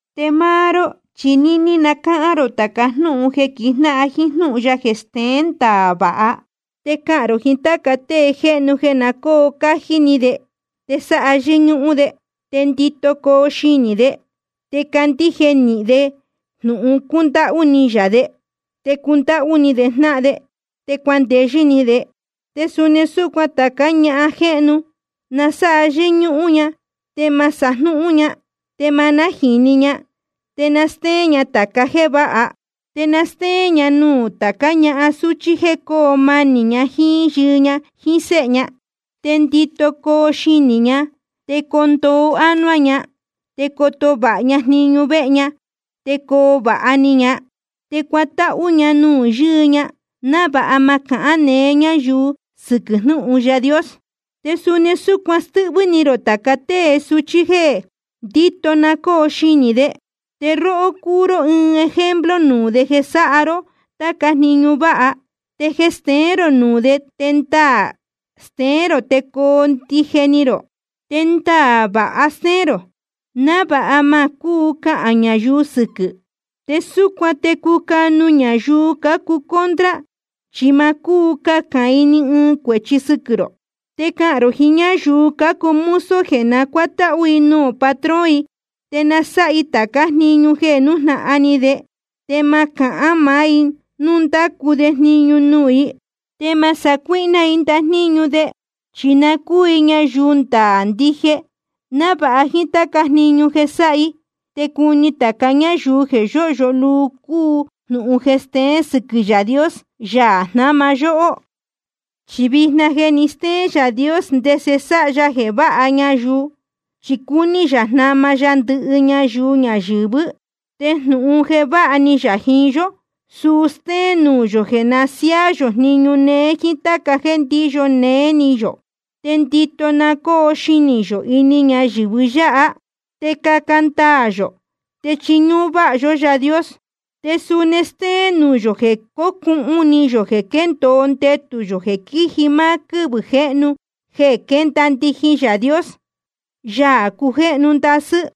Te máá ró chi níní na cáhán rō tāca jnúhun jeē quijnáhan jíín jnúhun ya jeē steén ndaā vāha. Te cahān rō jiín tāca tée jéhnu jeē na cóo cájí ni de, te sáha yɨ́ñúhún de, te ndito coo xinī de, te candíje nīhin de jnūhun cúndáhú ni yā de, te cundáhú ni de jnáhan de, te cuandeyɨ́ ni de. Te suni súcuan tācá ñahan jéhnu, na sáha yɨ́ñúhún ña, te ma sajnúhún ña, te ma nájīni ña. Te na stéén ña tāca jéē váha. Te na stéén ña nuū tācá ñahan súchí jéē coo manī ña jíín yɨɨ ña jíín séhe ña. Te ndito coo xinī ña, te coo ndoo ánuá ña, te coto vāha ña jniñu vehe ña, te coo vāha ni ña, te cuatáhú ña nuū yɨɨ ña, návāha ma cahán neé ñáyuu sɨquɨ̄ jnúhun Yaā Dios. Te suni súcuan stɨ́hvɨ́ ni rō tāca tée suchí jeē ndito na cóo xinī de. Te róhó, cuu ró ɨɨn ejemplo nuū de jeē sáha ró táca jniñu váha. Te jeē steén rō nuū de te ndaā steén rō te coo ndije ni rō. Te ndaā vāha stéén rō, návāha ma cúu cahān ñayuu sɨquɨ̄. Te súcuan te cucanu ñayuu cácuu contra, chi ma cúu cahān i ni ɨɨn cuēchi sɨquɨ̄ rō. Te cahān rō jiín ñáyuu cácuu mozo jeē na cuátáhú i nuū patrón i, te na sáha i tācá jniñu jeē nújnahan ni de, te ma cahán maá i núu ndácu de jniñu nuū i. Te ma sacuíhná i ndajníñu de, chi na cúu i ñayuu ndaā ndije, návāha jíín táca jniñu jeē sáha i, te cuni tāca ñáyuu jeē yóhyo luu cúu jnūhun jeē steén sɨquɨ̄ Yaā Dios, Yaā jnáma yóhó. Chi vijna je ni steén Yaā Dios ndese sáha ya jeē váha ñayuu, chi cúní yā jnama ya ndɨhɨ ñayuu ñayɨ̄vɨ́. Te jnūhun jeē váha ni yā jiín yó, suu stéén nuū yō jeē na siáá yō jniñu néé jíín táca jéē ndíyo néé ni yō. Te ndito na cóo xinī yō ini ñayɨ̄vɨ yáha, te caca ndaā yō, te chiñúhún váha yó Yaā Dios. Te suni stéén nuū yō jeē cocuhun ni yō jeē quéndōo ndetū yō jeē quíji máá quɨ́vɨ̄ jéhnu jeē quénda ndijin Yaā Dios, Yaā cujéhnu ndasɨ́,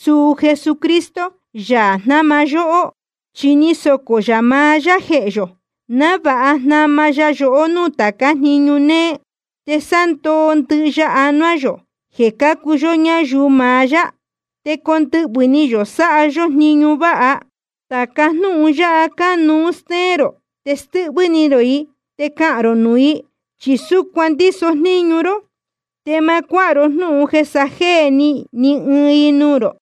suu Jesucristo, Yaā jnáma yóhó. Chi ni socō yā maá yá jehē yō, návāha jnama ya yohó núū táca jniñu néé, te sándoo ndɨhɨ ya anuá yō jeē cuu yó ñáyuu maá yá, te condɨhvɨ̄ ni yō sáha yó jniñu váha. Tāca jnúhun yáha cánuú stéén rō, te stɨ́hvɨ́ ni rō i, te cahān rō nuū i, chi súcuan ndíso jníñu ró. Te ma cuáha ro jnúhun jeē sajéē ni ni ɨɨn i nuū rō.